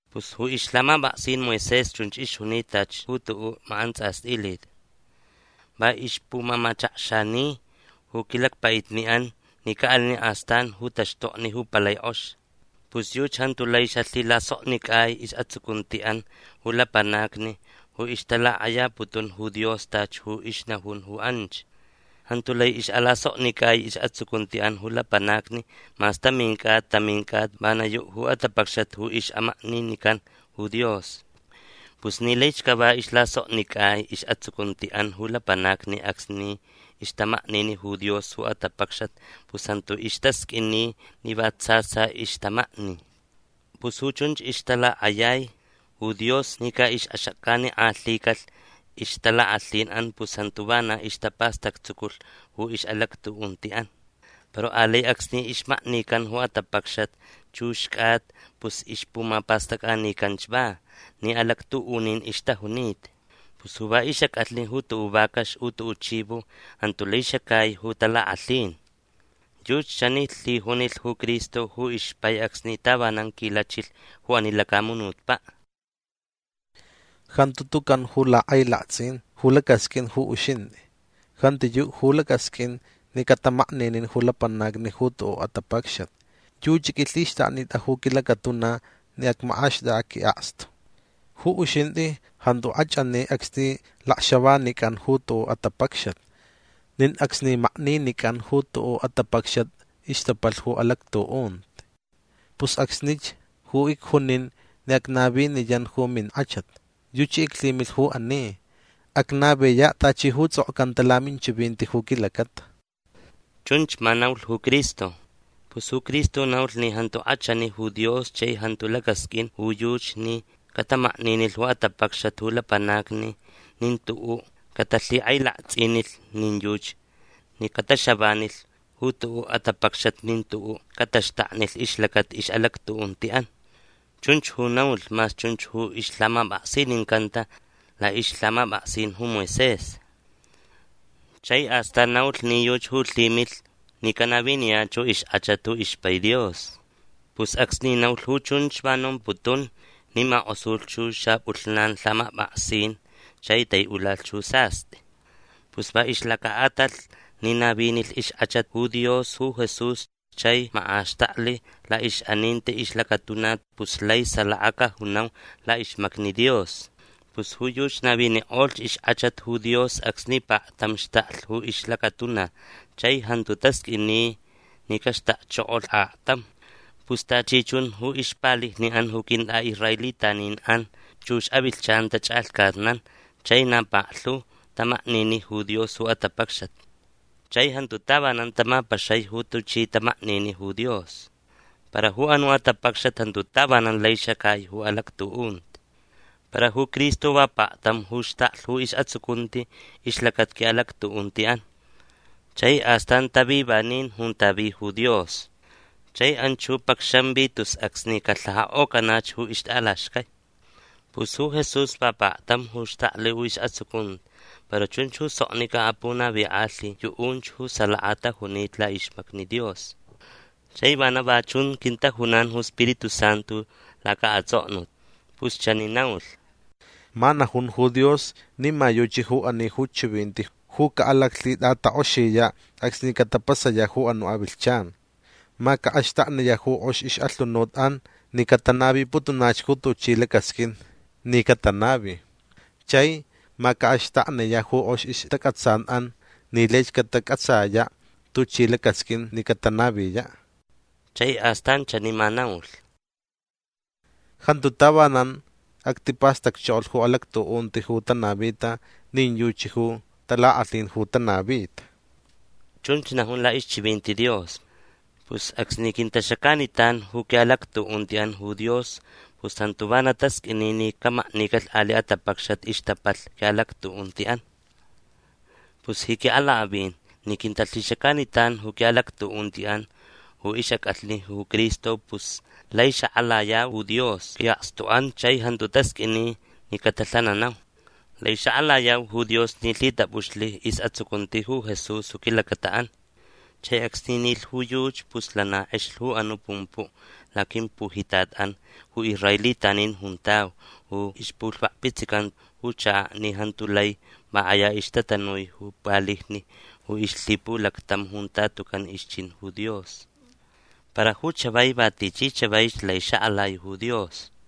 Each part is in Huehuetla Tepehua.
Pus ju ixlhamapʼaksin Moisés chunch ixjunita tachi ju tuʼuʼ makʼantsʼastʼilit. Va ixpumamachakxani ju quilacpaʼitniʼan ni caʼalinaʼ astan ju taxtokni ju palai kʼox. Pus yuchi jantu lai xalhilasoknicʼai isʼatsucuntiʼan ju lapanacni ju ixtalakʼayaputun ju Dios tachi ju ixnajun ju anch. Jantu lai ixʼalasoknicʼai isʼatsucuntiʼan ju lapanacni mas tamin cʼata tamin cʼata vana yuʼ ju atapacxat ju ixʼamakninican ju Dios. Pus ni laich cava islasoknicʼai isʼatsucuntiʼan ju lapanacni acsni ixtamaknini ju Dios ju atapacxat pus jantu istasqʼuini ni va tsa tsa ixtamakni. Pus ju chunch ixtalakʼayai ju Dios ni caʼixʼaxacanikʼalhicalh ixtalakʼalhinʼan pus jantu vana ixtapastactsuculh ju ixʼalactuʼuntiʼan. Para alai acsni ixmaknican ju atapacxat chux cʼata pus ixpumapastʼacʼanicanch va ni alactuʼunin ixtajunita. Pus ju va ixʼacʼalhni ju tuʼuʼ vacax u tuʼuʼ chivo jantu lai xacai ju talakʼalhin. Yuchi chani lhijunilh ju Cristo ju ixpai acsni tavanan quilachilh ju ani lacamunutpaʼ: Jantu tucan ju lhakʼailaktsʼin ju lacʼasqʼuin ju uxintʼi. Jantiyuʼ ju lacasqʼuin ni catamakninin ju lapanacni ju tuʼuʼ atapacxat. Yuchi qʼuilhixtʼaknitʼa ju quilacatuna ni acmakʼaxtʼakʼaʼ quiʼakstu. Ju uxintʼi jantu kʼachʼani acsni lacxavanicʼan ju tuʼuʼ atapacxat. Nin acsni makninicʼan ju tuʼuʼ atapacxat ixtapalh ju alactuʼunti. Pus acsnich ju icjunin ni acnaviniyan ju minkʼachat. Yuchi iclhimilh ju ani. Acnaviyaʼ tachi ju tsʼokcanta laminchivinti ju quilacata. Chunch ma naulh ju Cristo. Pus ju Cristo naulh ni jantu kʼachani ju Dios chai jantu lacasqʼuin ju yuchi ni catamakninilh ju atapacxcat ju lapanacni nin tuʼuʼ catalhikʼailaktsʼinilh nin yuchi ni cataxavanilh ju tuʼuʼ atapacxat nin tuʼuʼ cataxtaknilh ixlacata ixʼalactuʼuntiʼan. Chunch ju naulh mas chunch ju ixlhamapʼaksinincanta laʼixlhamapʼaksin ju Moisés. Chai astan naulh ni yuchi ju lhimilh ni canaviniyach ju ixkʼachat ju ixpai Dios. Pus acsni naulh ju chunch va nomputun ni makʼosulh ju xapʼulhnan lhamapʼaksin chai taiʼula ju sastʼi. Pus va ixlacaʼatalh ni navinilh ixkʼachat ju Dios ju Jesús chai makʼaxtaklh laʼixʼaninti ixlacatuna pus lai salaka cajunau laʼixmacni Dios. Pus ju yuchi navinikʼolh ixkʼachat ju Dios acsni paktam xtaklh ju ixlacatuna chai jantu tasqʼuini ni caxtakchokolh aktam. Pus tachi chun ju ixpalijniʼan ju quintʼaʼisraelitaninʼan chux avilhchan tachʼalhcatnan chai na paklhu tamaknini ju Dios ju atapacxat. Chai jantu tavanan tamapaxai ju tuchi tamaknini ju Dios. Para ju anuʼ atapacxat jantu tavanan lai xacai ju alactuʼunti. Para ju Cristo va paktam ju xtaklh ju isʼatsucunti ixlacata quiʼalactuʼuntiʼan. Chai astan tavi vanin junta vi ju Dios. Chai anch ju pacxanvi tus acsni calhajakʼocanach ju ixtʼalaxcai. Pus ju Jesús va paktam ju xtaklh ju isʼatsucunti para chunch ju soknicʼa punavikʼalhi yuʼunch ju salaka tajunita laʼixmacni Dios. Chai vana va chun quintajunan ju Spiritu Santu lacaʼatsʼoknut. Pus chani naulh: Ma najun ju Dios ni ma yuchi ju ani ju chivinti ju caʼalaclhitʼatakʼoxiyaʼ acsni catapasayaʼ ju anuʼ avilhchan. Ma caʼaxtakniyaʼ ju kʼox ixʼalhunutʼan ni catanaviputunach ju tuchi lacasqʼuin ni catanavi. Chai ma caʼaxtakniyaʼ ju kʼox ixtacʼatsanʼan ni laich catacʼatsayaʼ tuchi ju lacasqʼuin ni catanaviyaʼ. Chai astan chani ma naulh: Jantu tavanan actipastacchokolh ju alactuʼunti ju tanavita nin yuchi ju talakʼalhin ju tanavita. Chunch najun laʼixchivinti Dios. Pus acsni quintaxacanitan ju quiʼalactuʼuntiʼan ju Dios pus jantu vana tasqʼuini ni camaknicalh aliʼ atapacxat ixtapalh quiʼalactuʼuntiʼan. Pus ji quiʼalakʼavin ni quintalhixacanitan ju quiʼalactuʼuntiʼan ju ixʼacʼalhni ju Cristo pus lai xakʼalayau ju Dios quiʼakstuʼan chai jantu tasqʼuini ni catalhananau. Lai xakʼalayau ju Dios ni lhitʼapʼuxlh isʼatsucunti ju Jesús ju quilacataʼan. Chai acsni nilh ju yuchi pus lana kʼexlh ju anuʼ pumpuʼ laquimpujitatʼan ju israelitanin juntau ju ixpulhvakpitsican ju chakaʼ ni jantu lai va kʼaya ixtatanui ju palijni ju ixlhipulactam junta tucan ixchin ju Dios. Para ju chavai va tichi chavaich lai xakʼalai ju Dios.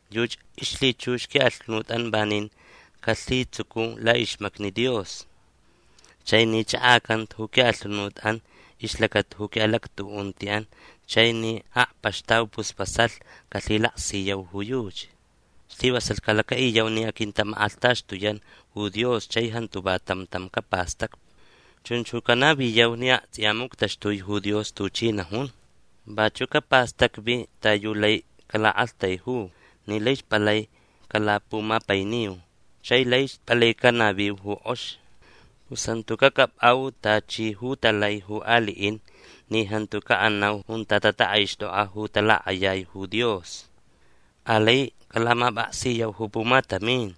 Yuchi ixlhichux quiʼalhunutʼan vanin calhitsucu laʼixmacni Dios. Chai ni chʼakʼacanta ju quiʼalhunutʼan ixlacata ju quiʼalactuʼuntiʼan chai ni akpaxtau pus vasalh calhilaksiyau ju yuchi. Slivasalh calacaʼiyau ni aquintamakʼalhtaxtuyan ju Dios chai jantu va tam tam capastacvi. Chunch ju canaviyau ni aktsʼiya muctaxtui ju Dios tuchi najun. Vachuʼ capastacvi ta yu lai calaʼaktaiju ni laich palai calapumapainiu chai laich palai canaviu ju kʼox. Pus jantu cacʼapʼau tachi ju talai ju aliʼin ni jantu caʼanau junta tatakʼaixtʼokʼa ju talakʼayai ju Dios. Alai calamapʼaksiyau ju pumatamin.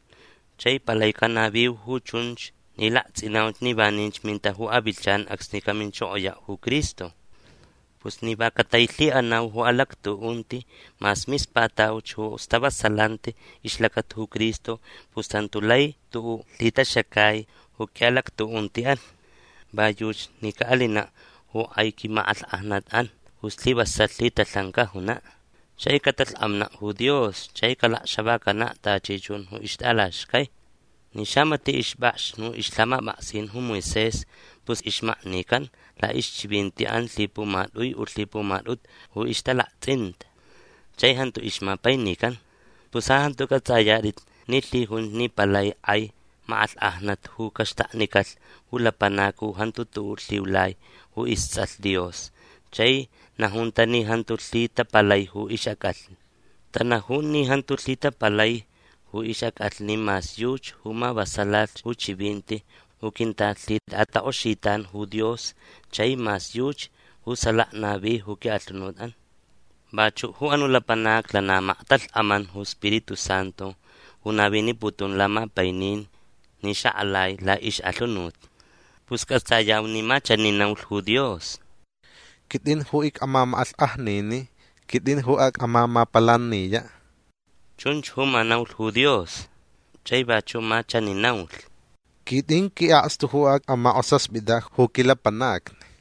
Chai palai canaviu ju chunch ni laktsʼinauch ni vaninch minta ju avilhchan acsni caminchokoyaʼ ju Cristo. Pus ni va catailhiʼanau ju alactuʼunti mas mispatauch ju stavasalanti ixlacata ju Cristo pus jantu lai tuʼuʼ lhitaxacai ju quiʼalactuʼuntiʼan. Va yuchi ni caʼalinaʼ ju kʼai quimakʼalhkʼajnatʼan ju slivasalh lhitalhan cajunaʼ. Chai catalhkʼamnaʼ ju Dios chai calacxavacanaʼ tachi chun ju ixtʼalaxcai. Ni xamatiʼ ixpʼakx ju ixlhamapʼaksin ju Moisés pus ixmaknican laʼixchivintiʼan lhipumatʼui u lhipumatʼutu ju ixtalaktsʼinta. Chai jantu ixmapainican. Pus ja jantu cʼatsʼayatʼit ni lhijunch ni palai kʼai makʼalhkʼajnat ju caxtaknicalh ju lapanac ju jantu tuʼuʼ lhiulai ju istsʼalh Dios chai najunta ni jantu lhitapalai ju ixʼacʼalhni. Tanajun ni jantu lhitapalai ju ixʼacʼalhni mas yuchi ju mavasalalh ju chivinti ju quintalhitʼatakʼoxitan ju Dios chai mas yuchi ju salaka navi quiʼalhunutʼan. Vachuʼ ju anuʼ lapanac lana maktalhkʼaman ju Spiritu Santu ju naviniputun lamapainin ni xakʼalai laʼixʼalhunut. Pus cʼatsayau ni ma chani naulh ju Dios: “Quitʼin ju icʼamamakʼalhkʼajniniʼ. Quitʼin ju acmamapalaniyaʼ”. Chunch ju ma naulh ju Dios. Chai vachuʼ ma chani naulh: “Quitʼin quiʼakstu ju acmakʼosaspitaʼ ju quilapanacni”.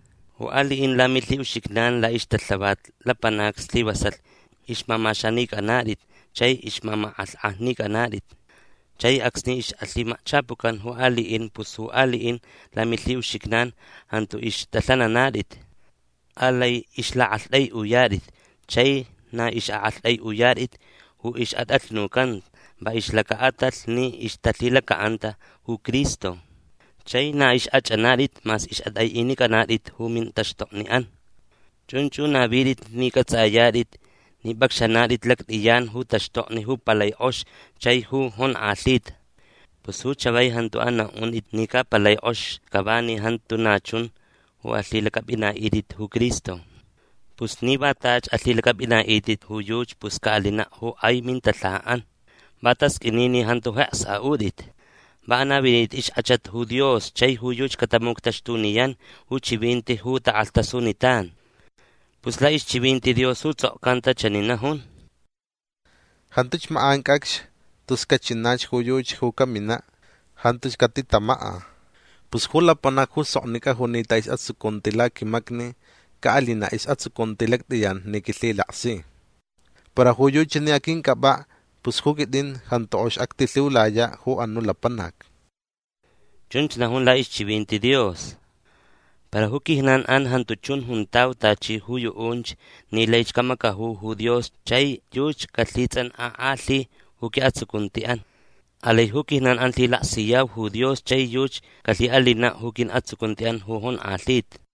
Ju aliʼin lamilhiʼuxijnan laʼixtalhavat lapanacni slivasalh ixmamaxanicʼanatʼit chai ixmamakʼalhkʼajnicʼanatʼit. Chai acsni ixʼalhimakchapucan ju aliʼin pus ju aliʼin lamilhiʼuxijnan jantu ixtʼalhananatʼit. Alai ixlaʼaktʼaiʼuyatʼit. Chai na ixʼaʼaktʼaiʼuyatʼit ju ixʼatʼalhnucanta va ixlacaʼatalh ni ixtalhilacaʼanta ju Cristo. Chai na ixkʼachʼanatʼit mas ixʼatʼaiʼinicʼanatʼit ju mintaxtokniʼan. Chunch ju navitʼit ni cʼatsʼayatʼit ni pʼacxanatʼit lactʼiyan ju taxtokni ju palai kʼox chai ju jonkʼalhita. Pus ju chavai jantu anaʼuntʼit ni ca palai kʼox cava ni jantu na chun ju alhilacʼapʼinaʼitʼit ju Cristo. Pus ni va tachi alhilacʼapʼinaʼitʼit ju yuchi pus caʼalinaʼ ju kʼai mintalhajaʼan. Va tasqʼuini ni jantu jeks aʼutʼit. Va anavinitʼit ixkʼachat ju Dios chai ju yuchi catamuctaxtuniyan ju chivinti ju takʼalhtasunitan. Pus laʼixchivinti Dios ju tsʼokcanta chani najun: Jantuch makʼan cʼacx tus cachinach ju yuchi ju caminaʼ. Jantuch catitamakʼa. Pus ju lapanac ju soknicʼa junita isʼatsucunti laquimacni caʼalinaʼ isʼatsucunti lactʼiyan ni quilhilaksi. Para ju yuchi ni aquincʼapʼaʼ pus ju quitʼin jantu kʼox actilhiulayaʼ ju anuʼ lapanac. Chunch najun laʼixchivinti Dios. Para ju quijnanʼan jantu chun juntau tachi ju yuʼunch ni laich camacaju ju Dios chai yuchi calhitsʼankʼakʼalhi ju quiʼatsucuntiʼan. Alai ju quijnanʼan lhilaksiyau ju Dios chai yuchi calhiʼalinaʼ ju quiʼatsucuntiʼan ju jonkʼalhita.